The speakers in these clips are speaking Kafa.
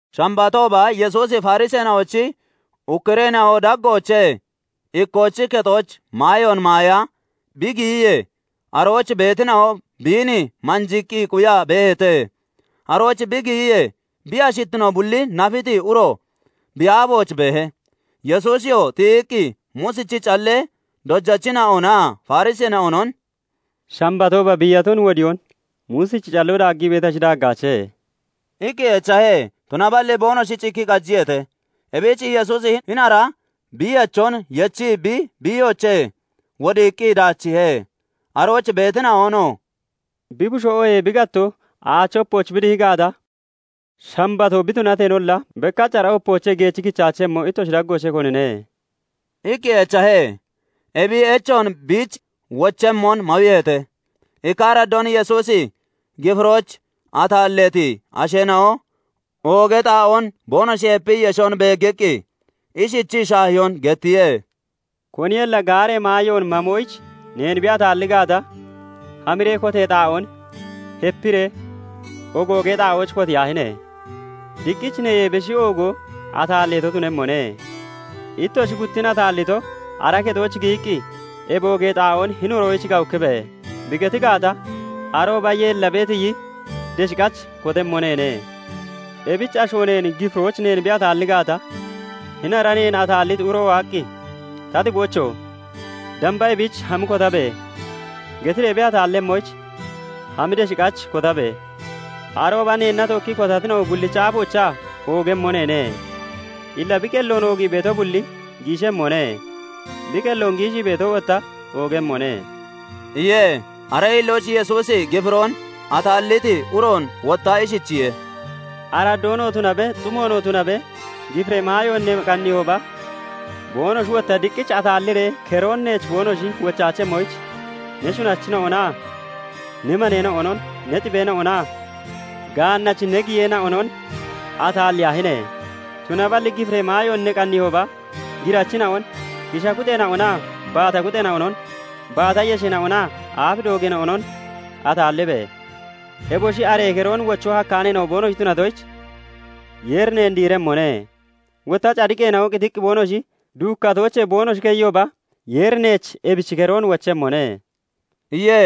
Shambatooba Yesuusi Fariseena'ochi ukkureena'o daggoochee ikkoochi kexooch maayoon maaya bi giyiyee, arooch beetina'o biin manjiiqqi quyaa beeheete. Arooch bi giyiyee, bi ashittino bulli nafiti uro bi aafooch beehe. Yesuusiyoo tiyiqqi Muusichi callee dojachina'onaa Fariseena'onon "Shambatooba biiyaton wodiyoon Muusichi calloo daaggii beetashi, daaggaache?" iqqi echahe. Tunaballi boonoshi cikkii qajiyeete. Ebich Yesuusi hini ara biiyachon yechii bi biiyoochee wodiiqqi daachiihe. Arooch beetina'onoo " Bi bushoo oohee bi gattoo aachi opooch bi dihi gaata, Shambatoo bi tunateenolla, bekkach ara opoochee geechi kichaachemmo Ittoshi daggoochee konine?" iqqi echahe. Ebi echoon biich wochemmon mawiiheete. Ikka araddoon Yesuusi gifirooch ataalleeti asheena'o oogee xaa'oon boonoshi hepii yeshon beeggiqqi ishichii shaahiyoon gettiye; "Koniyolla gaaree maayoon mamoyich neen bi ataalli gaata, hamiree kotee xaa'oon hepiree ogoogee xaa'ooch kotiyaahine! Diqqich neyee beshi oogoo ataalleeto tunemmone; Ittoshi guttin ataallito ara kexooch giyiqqi, 'Ebi oogee xaa'oon hini uroyich gawukkibe!' bi geti gaata, arooba yeellabee tiyi desh qach kotemmo neene. Ebich asho neen gifirooch neen bi ataalli gaata, hini ara neen ataalliti uro waaqqi, 'Ta xiboocho! Damba ebiich hami kotabe!' getiree bi ataallemmoyich hami desh qach kotabe! Arooba neenna tookkii kotatina'o bullichi aafoochaa oogemmo neene. Illa bi qelloon oogii beeto bulli giishemmone; bi qelloon giishii beeto wotta oogemmone" iye. Aree hillooch Yesuusi gifiroon ataalliti uroon wotta ishichiye:- "Araddoonoo tunabe, xumoonoo tunabe gifiree maayoon ne qanniihooba, boonoshi wotta diqqich ataalliree keroon neech boonoshi wochaachemmoyich, ne shunachina'onaa ne maneena'onon, ne xibeena'onaa gaannachi ne giyeena'onon ataalliyaahine! Tunaballi gifiree maayoon ne qanniihooba, girachina'on, kisha kuxxeena'onaa baata kuxxeena'onon, baata yesheena'onaa aaf doogeena'onon ataallibe! Eboshi aree keroon wochoo hakkaaneena'o boonoshi tunatoyich, Yeeri neen diiremmone; wotta cadiqeena'o qitiqqi boonoshi duukkatoochee boonoshi keyiyooba, Yeeri neech ebichi keroon wochemmone" iye.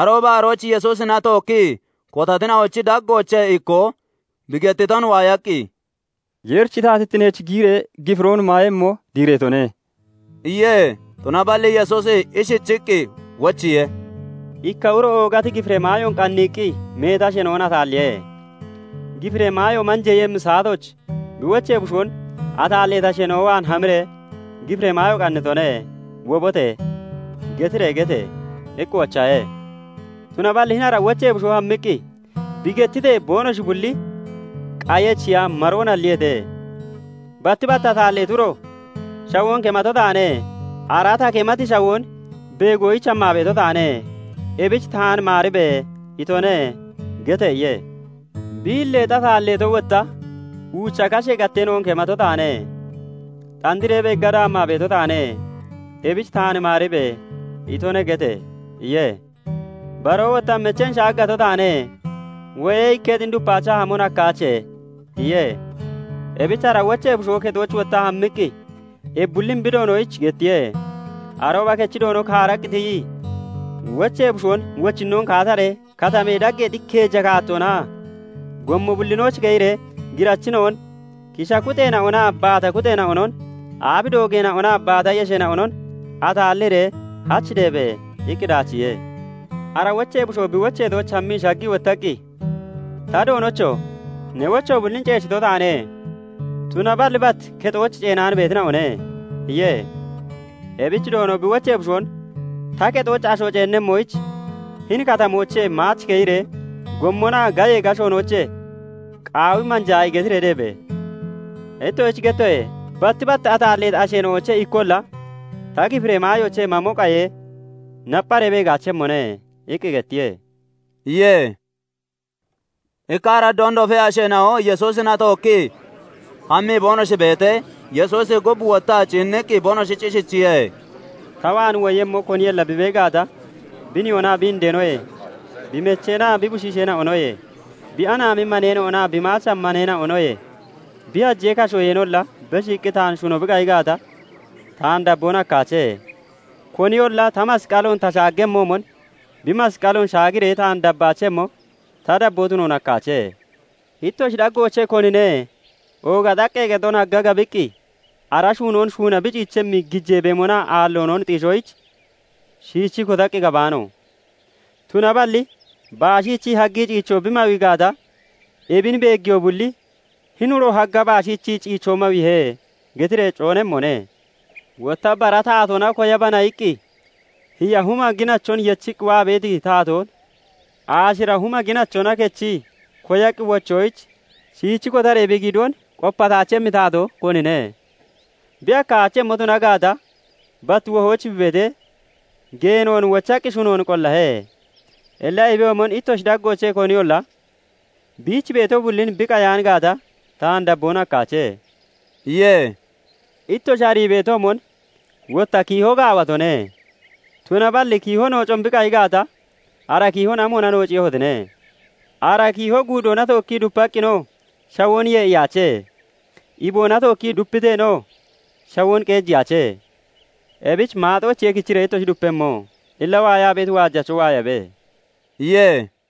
Arooba arooch Yesuusina tookkii kotatina'ochi daggoochee ikkoo bi gettiton waayaqqi, "Yeerichi taatittineech giyiree gifiroon maayemmo diireetone" iye. Tunaballi Yesuusi ishichiqqi wochiye; "Ikka uro oogati gifiree maayoon qanniiqqi meeti asheena'on ataalliye. Gifiree maayo manjeeyemmi saatooch bi wochee bushoon 'Ataalleeti asheena'o waan hamiree, "Gifiree maayo qannitone; wobote!" getiree gete!' iqqi wochahe. Tunaballi hini ara wochee bushoo hammiqqi bi gettitee, boonoshi bulli qayi echiya maroon halliyeete. "Batti bat ataalleeti uro ' " 'Shawoon kemato taane. Ara ta kemati shawoon beegoyich hammaa beeto taane; ebich taan maaribe!' itone" gete!' iye. "Bi hilleexi ataalleeto wotta ' " 'Uucha kashee gatteena'on kemato taane; xandiree beegga daammaa beeto taane; ebich taan maaribe!' itone" gete!' iye. "Baroo wotta 'Mecheen shaaggato taane; wo'ee ikketin dupaachaa hamon hakkaache' iye. "Ebich ara wochee bushoo kexooch wottaa hammiqqi ebi bullin bi doonoyich gettiye. Arooba kechi doono kaaraqqi tiyii, wochee bushoon 'Wochinnoon kaataree katamee dageexi keeja kaattoonaa gommo bullinooch keyiree girachina'on, kisha kuxeena'onaa baata kuxeena'onon, aaf doogeena'onaa baata yesheena'onon ataalliree hach deebe!' iqqi daachiihe. "Ara wochee bushoo bi wocheetooch hammii shaggii wottaqqi, 'Ta doonocho! Ne wocho bullin ceechito taane; tunaballi bat kexooch ceenaan beetina'one' iye. "Ebich doono bi wochee bushoon 'Ta kexooch asho ceennemmoyich hini katamoochee maach keyiree gommonaa gayee gashoonoochee qaawi manjaayi getiree deebe! Ittoshich gettoye; batti bat ataalleeti asheena'oochee ikkolla ta gifiree maayoochee mamo qayee, nappharee beeggaachemmone' iqqi gettiye" iye. Ikka araddoon dofee asheena'o Yesuusina tookkii hammii boonoshi beetee, Yesuusi gub wottaa ciinniqqi boonoshich ishichiye:- "Ta waan woyemmo koniyolla bi bee gaata, bi nihoonaa bi indeenoyee, bi mecheenaa bi bushiisheena'onoye, bi anaami maneena'onaa bi maacha maneena'onoye, bi hajee kashoyeenolla beshiiqqi taan shuno bi qayi gaata, taan dabboon hakkaache. Koniyolla ta masqaloon ta shaaggemmoomon bi masqaloon shaagiree taan dabaachemmo ta dabboo tunoon hakkaache. "Ittoshi daggoochee konine ooga xaqqee kexon hagga gabiqqi ara shuunoon shuuna bi ciichemmi gijee beemonaa aalloonon xiishoyich shiichii kotaqqi gabaano? Tunaballi baashiichii haggii ciichoo biin bi mawi gaata, ebin beeggiyoo bulli 'Hini uro hagga baashiichii ciichoo mawiihe' getiree coonemmone. "Wotta 'Bara taatoona koyabana!' iqqi hiya huma ginachon yechiqqi waa beeti taatoon aashira huma ginachona kechii koyaqqi wochoyich, shiich kotaree bi giidoon qopataachemmi taatoo konine? Bi hakkaachemmo tuna gaata, bat wohooch bi beetee, geenoon wochaqqi shunoon qollahe. Illa ebiyoomon ittoshi daggoochee koniyolla biich beeto bullin bi qayaan gaata, taan dabboon hakkaache" iye. "Ittoshi arii beetoomon wotta kiiho gaawatone; tunaballi kiiho noocon bi qayi gaata, ara kiihon amoona noociiyehotine? Ara kiiho guudoona tookkii dupaqqinoo shawoon yee'iyaache; iboona tookkii dupiteenoo shawoon qeejiyaache; ebich maaxoochiye kichiree ittoshi dupemmo. "Illa waayaa beeti waajacho waayabe!" iye.